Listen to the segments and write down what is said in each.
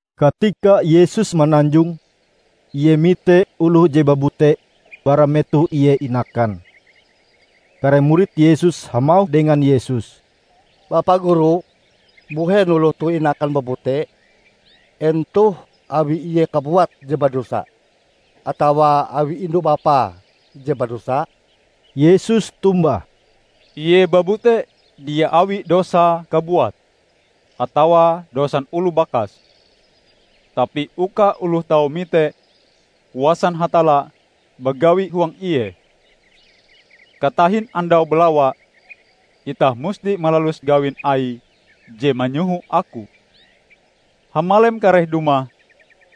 Katika Yesus mananjong, Ie mite oloh je babute bara metoh ie inakan. Kare murid Yesus hamauh dengan Yesus, "Bapa Guru, mbuhen oloh toh inakan babute? En toh awi ie kabuat je badosa atawa awi indu-bapae je badosa?" Yesus tombah, "Ie babute dia awi dosae kabuat atawa dosan oloh bakase, tapi uka oloh tau mite kuasan Hatalla bagawi huang ie. Katahin andau balawa, itah musti malalus gawin Aie je manyoho Aku. Hamalem kareh dumah,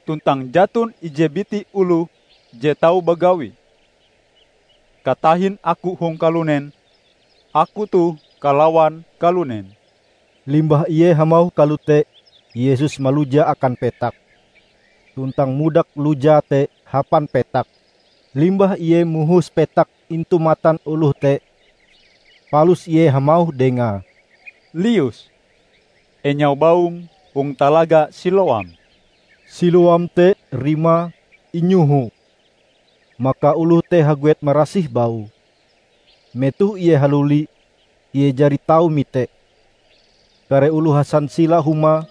tuntang jaton ije biti oloh je tau bagawi. Katahin Aku hong kalunen, Aku toh kalawan kalunen." Limbah Ie hamauh kalote Yesus maluja akan petak, tuntang mudak lujae te hapan petak. Limbah Ie mohos petak intu matan oloh te, palus Ie hamauh dengae, "Lius, enyau baum hong Talaga Siloam." (Siloam te rimae 'Inyoho'.) Maka oloh te haguet marasih baue. Metoh ie haluli, ie jari tau mite. Kare oloh hasansila humae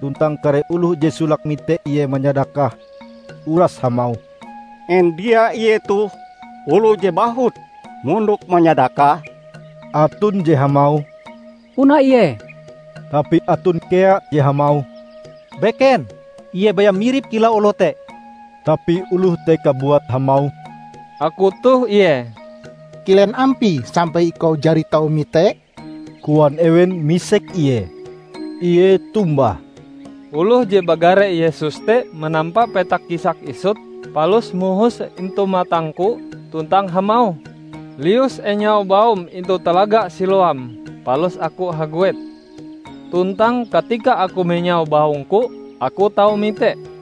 tuntang kare oloh je solake mite ie manyadakah, uras hamauh, "En dia ie toh oloh je bahut mondok manyadakah?" Aton je hamauh, "Puna ie." Tapi aton kea je hamauh, "Beken, ie baya mirip kilau oloh te." Tapi oloh te kabuat hamauh, "Aku toh ie." "Kilen ampie sampai ikau jari tau mite?" koan ewen misek ie. Ie tombah, "Oloh je bagare Yesus te manampa petak kisak isut, palus mohose intu matangku tuntang hamauh, 'Lius enyau baum intu Talaga Siloam,' Palus aku haguet. Tuntang katika aku menyau baungku, aku tau mite."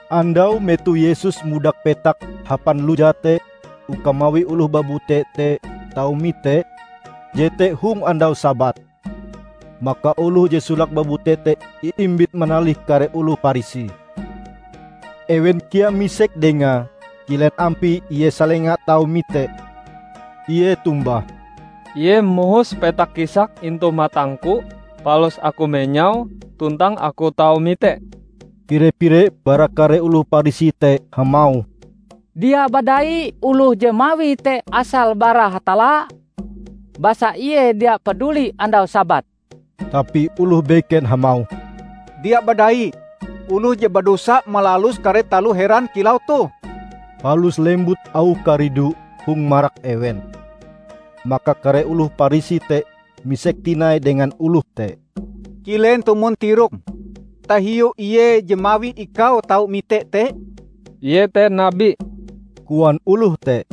Andau metoh Yesus mudak petak hapan lujae te uka mawi oloh babute te tau mite, jete hong andau Sabat. Maka oloh je solake babute te iimbit manalih kare oloh Parisi. Ewen kea misek dengae kilen ampie ie salenga tau mite. Ie tombah, "Ie mohos petak kisak intu matangku, palus aku menyaue tuntang aku tau mite." Pire-pire bara kare oloh Parisi te hamauh, "Dia badai oloh je mawie te asale bara Hatalla, basa Ie dia paduli andau Sabat." Tapi oloh beken hamauh, "Dia badai oloh je badosa malalus kare taloh heran kilau toh?" Palus lembut auh karidu hong marak ewen. Maka kare oloh Parisi te misek tinai dengan oloh te, "Kilen tumon tirokm tahiu Ie je mawi ikau tau mite te?" "Ie te nabi," koan oloh te.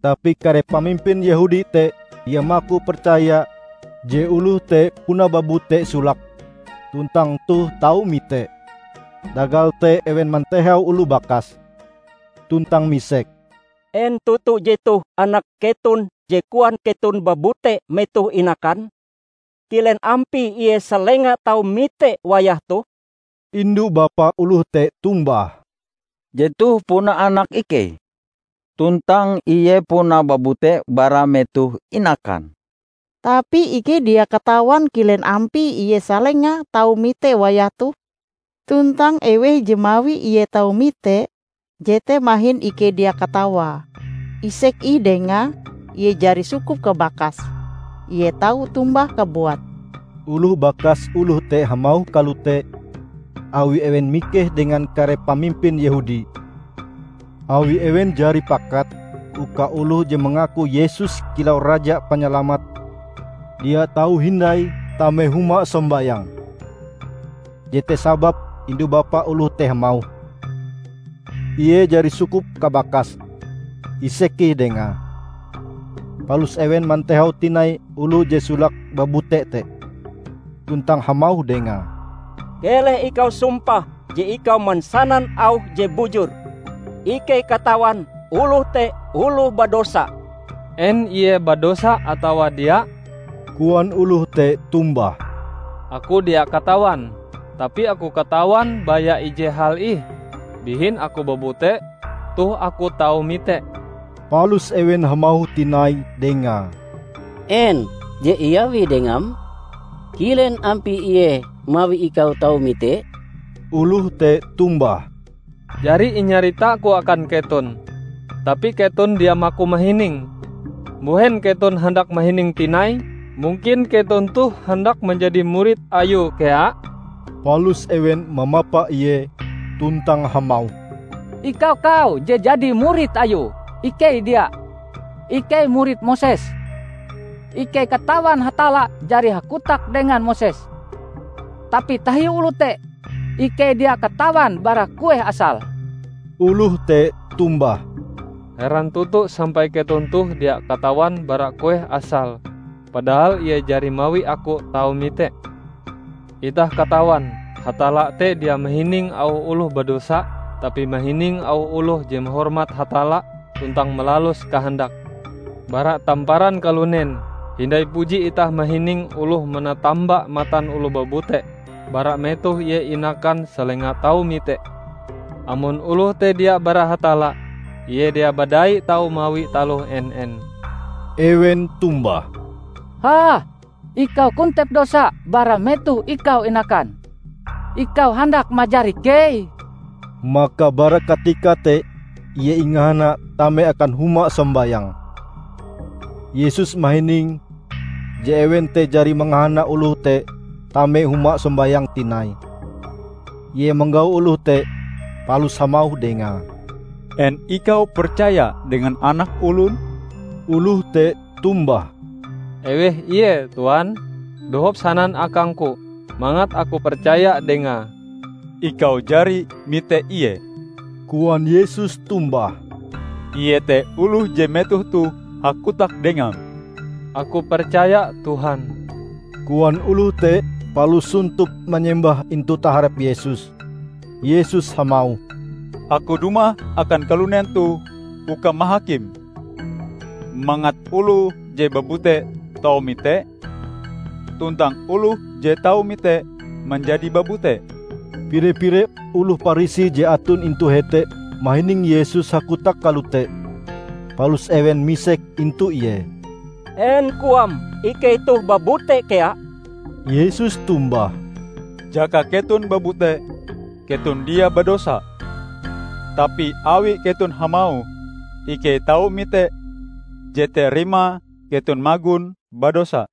Tapi kare pamimpin Yehudi te dia maku percaya je oloh te puna babute solake tuntang toh tau mite. Tagal te ewen mantehau oloh bakase, tuntang misek, "En toto jetoh anak keton je koan keton babute metoh inakan? Kilen ampie ie salenga tau mite wayah toh?" Indu-bapa oloh te tombah, "Jetoh puna anak ikei; tuntang ie puna babute bara metoh inakan. Tapi ikei dia katawan kilen ampie ie salenga tau mite wayah toh. Tuntang eweh je mawi ie tau mite, jete mahin ikei dia katawae isek ih dengae, ie jari sukup kabakase; ie tau tombah kabuat." Oloh bakas oloh te hamauh kalote awi ewen mikeh dengan kare pamimpin Yehudi; awi ewen jari pakat, uka oloh je mangaku Yesus kilau Raja Panyalamat, dia tau hindai tame huma sombayang. Jete sababe indu-bapa oloh te hamauh, "Ie jari sukup kabakase; isek ih dengae." Palus ewen mantehau tinai oloh je solake babute te, tuntang hamauh dengae, "Keleh ikau sumpah je ikau mansanan auh je bujur. Ikei katawan oloh te oloh badosa." "En ie badosa atawa dia," koan oloh te tombah, "aku dia katawan. Tapi aku katawan baya ije hal ih; bihin aku babute, toh aku tau mite." Palus ewen hamauh tinai dengae, "En je iawie dengam? Kilen ampie Ie mawi ikau tau mite?" Oloh te tombah, "Jari inyaritaku akan keton, tapi keton dia maku mahining. Mbuhen keton handak mahining tinai? Mungkin keton toh handak manjadi murid Ayue kea?" Palus ewen mamapa ie tuntang hamauh, "Ikau kau je jadi murid Ayue; ikei dia! Ikei murid Moses. Ikei katawan Hatalla jari hakotak dengan Moses. Tapi tahiu oloh te, ikei dia katawan bara kueh asale." Oloh te tombah, "Heran toto sampai keton toh dia katawan bara kueh asale, padahal Ie jari mawi aku tau mite. Itah katawan Hatalla te dia mahining auh oloh badosa, tapi mahining auh oloh je mahormat Hatalla tuntang malalus kahandake. Bara tamparan kalunen hindai puji itah mahining oloh manatamba matan oloh babute bara metoh ie inakan salenga tau mite. Amon oloh te dia bara Hatalla, ie dia badai tau mawi taloh en-en." Ewen tombah, "Hah? Ikau kontep dosa bara metoh ikau inakan, ikau handak majar ikei?" Maka bara katika te ie ingahana tame akan huma sombayang. Yesus mahining je ewen te jari mangahana oloh te tame huma sombayang tinai. Ie manggau oloh te palus hamauh dengae, "En ikau percaya dengan Anak Olon?" Oloh te tombah, "Eweh Ie, tuan? Dohop sanan akangku mangat aku percaya dengae." "Ikau jari mite Ie," koan Yesus tombah. "Ie te oloh je metoh toh hakotak dengam." "Aku percaya, Tuhan," koan oloh te palus sontop manyembah intu taharep Yesus. Yesus hamauh, "Aku dumah akan kalunen toh uka mahakim; mangat oloh je babute tau mite, tuntang oloh je tau mite, manjadi babute." Pire-pire oloh Parisi je aton intu hete mahining Yesus hakotak kalote, palus ewen misek intu Ie, "En Koam ikei toh babute kea?" Yesus tombah, "Jaka keton babute, keton dia badosa. Tapi awi keton hamauh 'Ikei tau mite,' jete rimae keton magon badosa."